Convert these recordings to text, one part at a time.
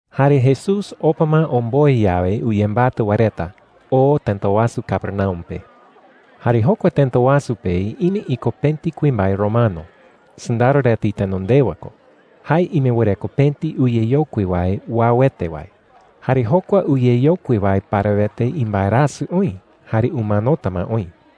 Jare Jesús opa ma omboe yawe uyembatɨ wae reta, oo tëta wasu Capernaum pe. Jare jokua tëta wasu pe ime iko pëti kuimbae romano; sɨndaro reta itenondewa ko. Jae ime wɨreko pëti uyeyokui wae uauete wae. Jare jokua uyeyokui wae parawete imbaerasɨ oï jare umanota ma oï.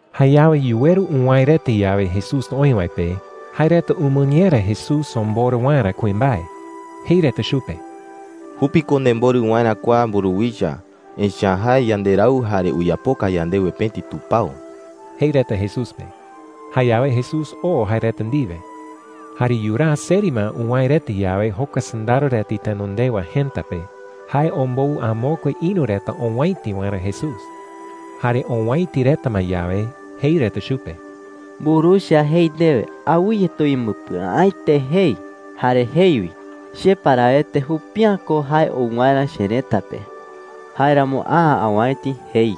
Jayawe yuweru uwäe reta yawe Jesús oï wae pe, jae reta umɨñera Jesús omborɨ waerä kuimbae. Jei reta chupe: “Jupi ko nemborɨ waerä kua mburuwicha. Echa’ä jae yanderau jare uyapoka yandewe pëti tupao,” jei reta Jesús pe. Jayawe Jesús oo jae reta ndiwe. Jare yuraa seri ma uwäe reta yawe jokua sɨndaro reta itenondewa jëta pe, jae ombou amokue ïru reta owäiti waerä Jesús. Jare owäiti reta ma yawe, jei reta chupe: “Mburuwicha jei ndewe: ‘Awɨye tuyembɨpɨa’äete,’ jei. Jare jei wi: ‘Che parawete jupi’ä ko jae ou waerä cherëta pe. Jáeramo a’ä awäiti,’ jei.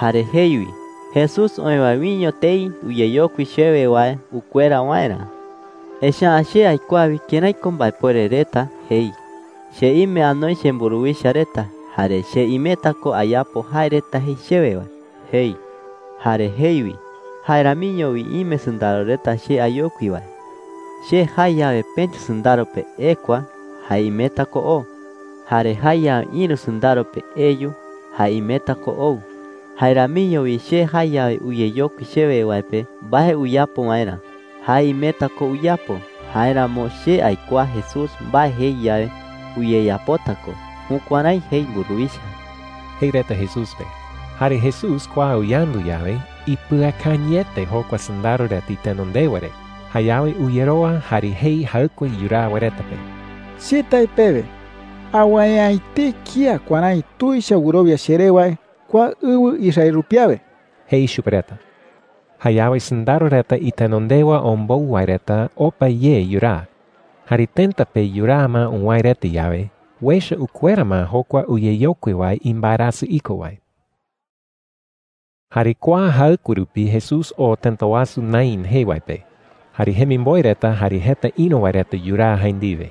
Jare jei wi: ‘Jesús oï wae wiño tei uyeyokui chewe wae ukuera waerä. Echa’ä che aikuaa wi kërái ko mbaepuere reta,’ jei. ‘Che ime anoi chemburuwicha reta, jare che imeta ko ayapo jae reta jei chewe wae,’ jei. Jare jei wi: ‘Jae ramiño wi ime sɨndaro reta che ayokui wae. Che jae yawe pëti sɨndaro pe, ‘Ekua,’ jae imeta ko oo. Jare jae yawe ïru sɨndaro pe, ‘Eyu,’ jae imeta ko ou. Jae ramiño wi che jae yawe uyeyokui chewe wae pe mbae uyapo waerä, jae imeta ko uyapo. Jáeramo che aikuaa Jesús mbae jei yawe, uyeyapota ko.’ Jukuärái jei mburuwicha,” jei reta Jesús pe. Jare Jesús kua uyandu yawe, ipɨakañɨete jokua sɨndaro reta itenondewa re. Jayawe uyerowa jare jei jaɨkue yuraa wae reta pe: “Che tae pewe, awäe’ä etei kía kuärái tuicha wɨrowia cheré wae kua ɨwɨ Israel rupi awe,” jei chupe reta. Jayawe sɨndaro reta itenondewa ombou wae reta opa ye yuraa. Jare tëta pe yuraa ma uwäe reta yawe, uecha ukuera ma jokua uyeyokui wae imbaerasɨ iko wae. Jare kua jaɨkue rupi Jesús oo tëta wasu Naín jee wae pe. Jare jemimboe reta jare jeta ïru wae reta yuraa jae ndiwe.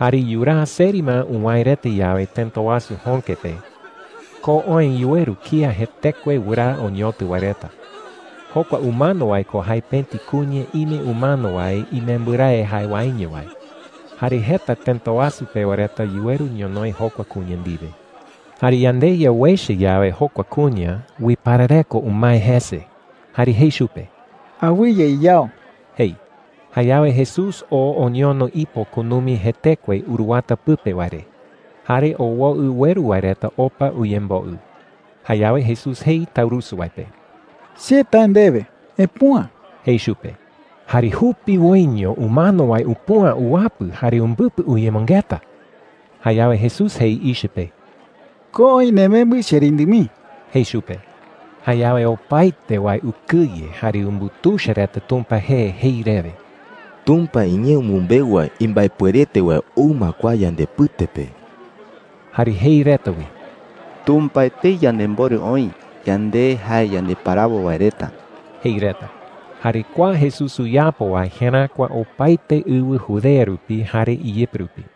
Jare yuraa seri ma uwäe reta yawe tëta wasu jöke pe, ko oë yuweru kía jetekue wɨraa oñotɨ wae reta. Jokua umano wae ko jae pëti kuña ime umano wae imembɨrae jae waeño wae. Jare jeta tëta wasu pewa reta yuweru ñonoï jokua kuña ndiwe. Jare yandeYa uecha yawe jokua kuña, uiparareko umae jese jare jei chupe: “Awɨye iyao,” jei. Jayawe Jesús oo oñono ipo kunumi jetekue uruwata pɨpe wae re. Jare owoɨ ueru wae reta opa uyemboɨ. Jayawe Jesús jei taurusu wae pe: “Che tae ndewe, epüa,” jei chupe. ¡Jare jupiwoiño umano wae upüa uwapɨ jare umbɨpɨ uyemɨngeta! Jayawe Jesús jei ichɨ pe: “Ko oï nemembɨ, cherindɨ mii,” jei chupe. Jayawe opaete wae ukɨye jare umbutuicha reta Tumpa jee jei rewe: “Tumpa iñee umɨmbeu wae imbaepuerete wae ou ma kua yandepɨte pe.” Jare jei reta wi: “Tumpa etei yanemborɨ oï, yande jae yandeparawo wae reta,” jei reta. Jare kua Jesús uyapo wae jeräkua opaete ɨwɨ Judea rupi jare iyɨpɨ rupi.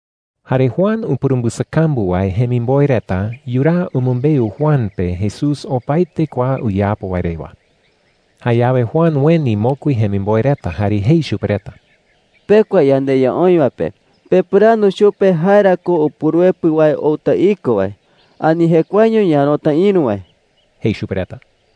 Jare Juan upurumbɨsakambu wae jemimboe reta yuraa umɨmbeu Juan pe Jesús opaete kua uyapo wae rewa. Jayawe Juan ueni mokui jemimboe reta jare jei chupe reta: “Pekua yandeYa oï wae pe pepɨrandu chupe jae ra ko Upuruepɨ wae outa iko wae, ani jekuaeño ñaärota ïru wae,” jei chupe reta.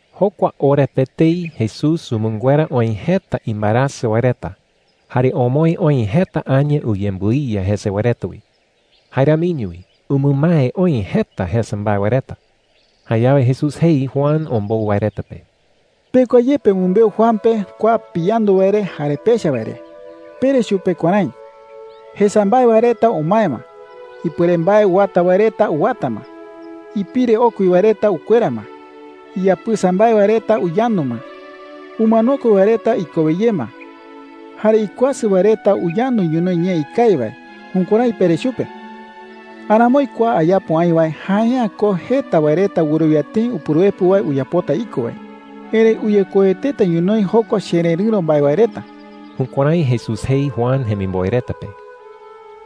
Jokua ora pe etei Jesús umɨnguera oï jeta imbaerasɨ wae reta, jare omoë oï jeta aña uyembɨiya jese wae reta wi. Jae ramiño wi umɨmae oï jeta jesa mbae wae reta. Jayawe Jesús jei Juan ombou wae reta pe: “Pekua ye pemɨmbeu Juan pe kua piyandu wae re jare pecha wae re. Pere chupe kuärái: ‘Jesa mbae wae reta umae ma. Ipuere mbae uwata wae reta uwata ma. Ipire okui wae reta ukuera ma. Iyapɨsa mbae wae reta uyandu ma. Umanokue wae reta ikowe ye ma. Jare ikuasɨ wae reta uyandu ñonoï ñee ikawi wae.’ Jukuärái pere chupe,” jei chupe reta. “Aramoi kua ayapo aï wae jae’ä ko jeta wae reta wɨrowia tëi Upuruepɨ wae uyapota iko wae. Erëi uyekoueteta ñonoï jokua chererɨ̈ro mbae wae reta.” Jukuärái Jesús jei Juan jemimboe reta pe.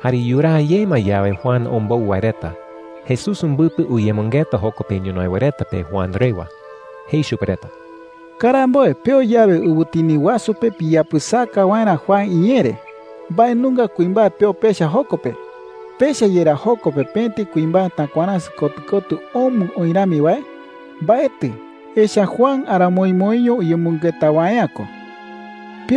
Jare yuraa ye ma yawe Juan ombou wae reta, Jesús umbɨpɨ uyemɨngeta joko pe ñonoï wae reta pe Juan rewa. Jei chupe reta: “Karamboe peo yawe ɨwɨtini wasu pe piyapɨsaka waerä Juan iñee re, ¿mbae nunga kuimbae peo pecha joko pe? ¿Pecha yerá joko pe pëti kuimbae takuaräsɨ kotɨ kotɨ omɨ oï rami wae? Mbaetɨ. Echa’ä Juan aramoimoiño uyemɨngeta wae’ä ko,” jei.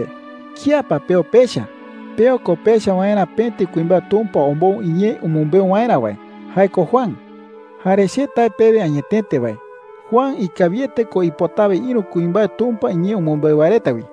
“Jayawe ¿kía pa peo pecha? Peo ko pecha waerä pëti kuimbae Tumpa ombou iñee umɨmbeu waerä wae – jae ko Juan. Jare che tae pewe añetete wae, Juan ikawiete ko ipotawe ïru kuimbae Tumpa iñee umɨmbeu wae reta wi.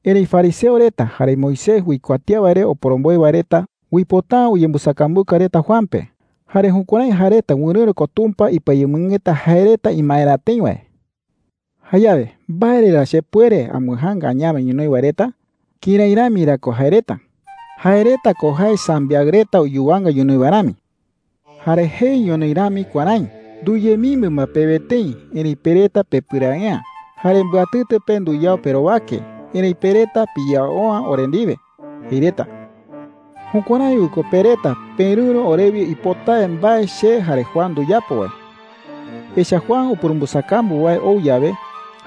“Erëi fariseo reta jare Moisés uikuatía wae re oporomboe wae reta uipota’ä uyembɨsakambuka reta Juan pe. Jare jukuärái jae reta wɨrɨ̈ro ko Tumpa ipɨayemɨngeta jae reta imaerä tëi wae,” jei chupe reta. “¿Jayawe mbae re ra chepuere ambɨjaanga añawe ñonoï wae reta? ¿Kërái rami ra ko jae reta? Jae reta ko jae sambiaɨ reta uyuwanga ñonoï wae rami,” jei. “Jare jei ñonoï rami kuärái: ‘Nduyemimbɨ ma pewe tëi, erëi pe reta pepɨrae’ä. Jare mbɨatɨtɨ pe nduyao perowake, erëi pe reta piyao’ä ore ndiwe,’ jei reta. Jukuärái wi ko pe reta perɨ̈ro orewi ipotawe mbae che jare Juan nduyapo wae,” jei. “Echa’ä Juan upurumbɨsakambu wae ou yawe,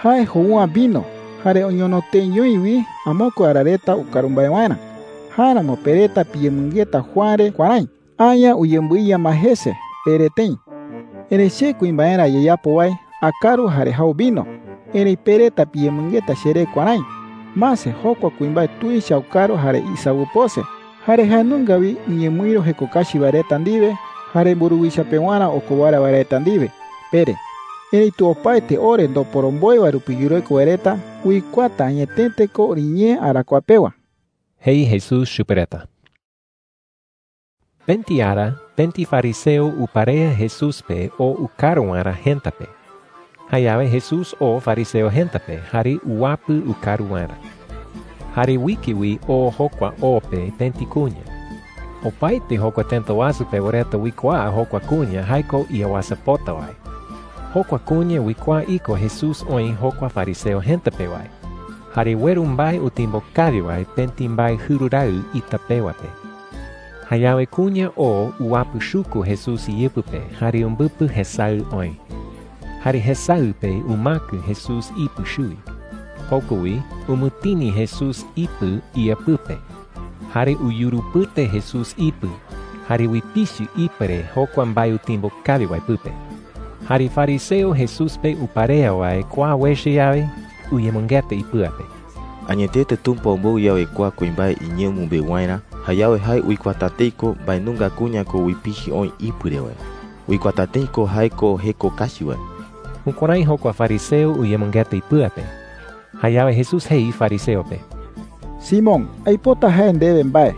jae jou’ä vino jare oñono teeñoi wi amokue ara reta ukaru mbae waerä. Jáeramo pe reta piyemɨngeta Juan re kuärái: ‘Aña uyembɨiya ma jese,’ pere tëi,” jei. “Erëi che kuimbaerä ayeyapo wae akaru jare jau vino. Erëi pe reta piyemɨngeta cheré kuärái: ‘Mase, jokua kuimbae tuicha ukaru jare isawɨpose. Jare jae nunga wi uñemɨïru jeko kachi wae reta ndiwe jare mburuwicha pewarä okowara wae reta ndiwe,’ pere. Erëitu opaete ore ndoporomboe wae rupi yureko wae reta uikuaata añetete ko oriñee arakuaa pewa,” jei Jesús chupe reta. Pëti ara pëti fariseo uparea Jesús pe oo ukaru waerä jëta pe. Jayawe Jesús oo fariseo jëta pe jare uwapɨ ukaru waerä. Jare uike wi oo jokua o pe pëti kuña. Opaete jokua tëta wasu pewa reta uikuaa jokua kuña jae ko iawasapota wae. Jokua kuña uikuaa iko Jesús oï jokua fariseo jëta pe wae. Jare ueru mbae utimbo kawi wae pëti mbae jɨru raɨ ita pewa pe. Jayawe kuña oo uwapɨchuku Jesús iyɨpɨ pe jare umbɨpɨ jesaɨ oë. Jare jesaɨ pe umäkɨ Jesús ipɨ chuwi. Joko wi umɨtini Jesús ipɨ ía pɨpe. Jare uyurupɨte Jesús ipɨ jare uipichɨ ipɨ re jokua mbae utimbo kawi wae pɨpe. Jare fariseo Jesús pe uparea wae kua uecha yawe, uyemɨngeta ipɨa pe: “Añetete Tumpa ombou yawe kua kuimbae iñee umɨmbeu waerä, jayawe jae uikuaata tëi ko mbae nunga kuña ko uipichɨ oï ipɨ re wae. Uikuaata tëi ko jae ko jeko kachi wae.” Jukuärái jokua fariseo uyemɨngeta ipɨa pe. Jayawe Jesús jei fariseo pe: “Simón, aipota jae ndewe mbae,”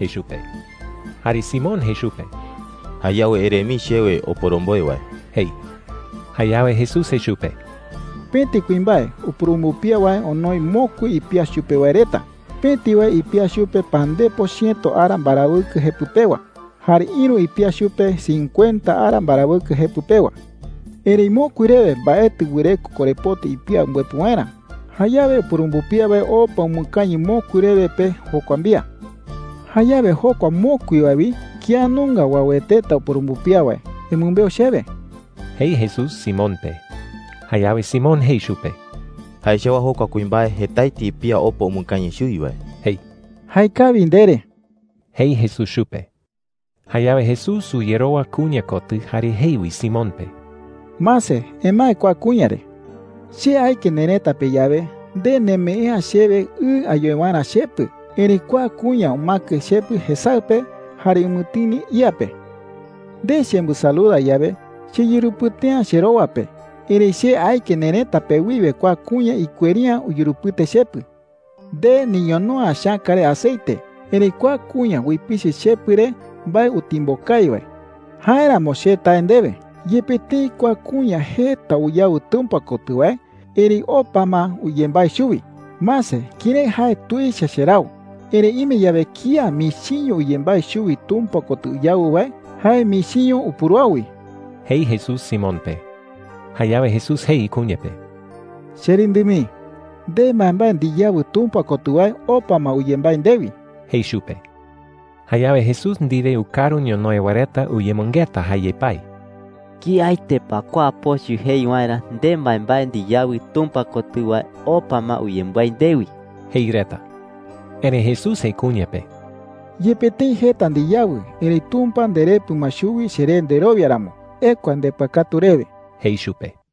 jei chupe. Jare Simón jei chupe: “Jayawe ere mii chewe, oporomboe wae,” jei. Jayawe Jesús jei chupe: “Pëti kuimbae upurumbɨpía wae onoi mokui ipía chupe wae reta. Pëti wae ipía chupe pandepo chiëto ara mbarawɨkɨ jepɨ pewa, jare ïru ipía chupe cincuenta ara mbarawɨkɨ jepɨ pewa,” jei. “Erëi mokui rewe mbaetɨ wɨreko korepoti ipía umbɨepɨ waerä. Jayawe upurumbɨpía wae opa umɨkañɨ mokui rewe pe jokua mbía,” jei. “Jayawe, jokua mokui wae wi, ¿kía nunga uaueteta upurumbɨpía wae? Emɨmbeu chewe,” jei Jesús Simón pe. Jayawe Simón jei chupe: “Jae chawaa jokua kuimbae jetaete ipía opa umɨkañɨ chuwi wae,” jei. “Jaekawi ndere,” jei Jesús chupe. Jayawe Jesús uyerowa kuña kotɨ jare jei wi Simón pe: “Mase, emae kua kuña re,” jei. “Che aike nerëta pe yawe, nde nemee’ä chewe ɨ ayoe waerä chepɨ. Erëi kua kuña umäkɨ chepɨ jesaɨ pe jare umɨtini ía pe,” jei chupe. “Nde chembɨsaluda yawe, cheyurupɨte’ä cherowa pe. Erëi che aike nerëta pe wiwe kua kuña ikueri’ä uyurupɨte chepɨ,” jei chupe. “Nde niñono’ä chäka re aceite. Erëi kua kuña uipichɨ chepɨ re mbae utimbo kawi wae,” jei chupe. “Jáeramo che tae ndewe, yepe tëi kua kuña jeta uyawɨ Tumpa kotɨ wae, erëi opa ma uyembái chuwi. Mase kërái jae tuicha cherau. Erëi ime yawe kía michiño uyembái chuwi Tumpa kotɨ uyawɨ wae, jae michiño upuruau wi,” jei Jesús Simón pe. Jayawe Jesús jei kuña pe: “Cherindɨ mii, nde mbaembae ndiyawɨ Tumpa kotɨ wae opa ma uyembái ndewi,” jei chupe. Jayawe Jesús ndiwe ukaru ñonoï wae reta uyemɨngeta jae yepái: “¿Kiaete pa kua pochɨ jei waerä, ‘Nde mbaembae ndiyawɨ Tumpa kotɨ wae opa ma uyembái ndewi’?” jei reta. Erëi Jesús jei kuña pe: “Yepe tëi jeta ndiyawɨ, erëi Tumpa nderepɨ ma chuwi cheré nderowia ramo. Ekua ndepɨakatu rewe,” jei chupe.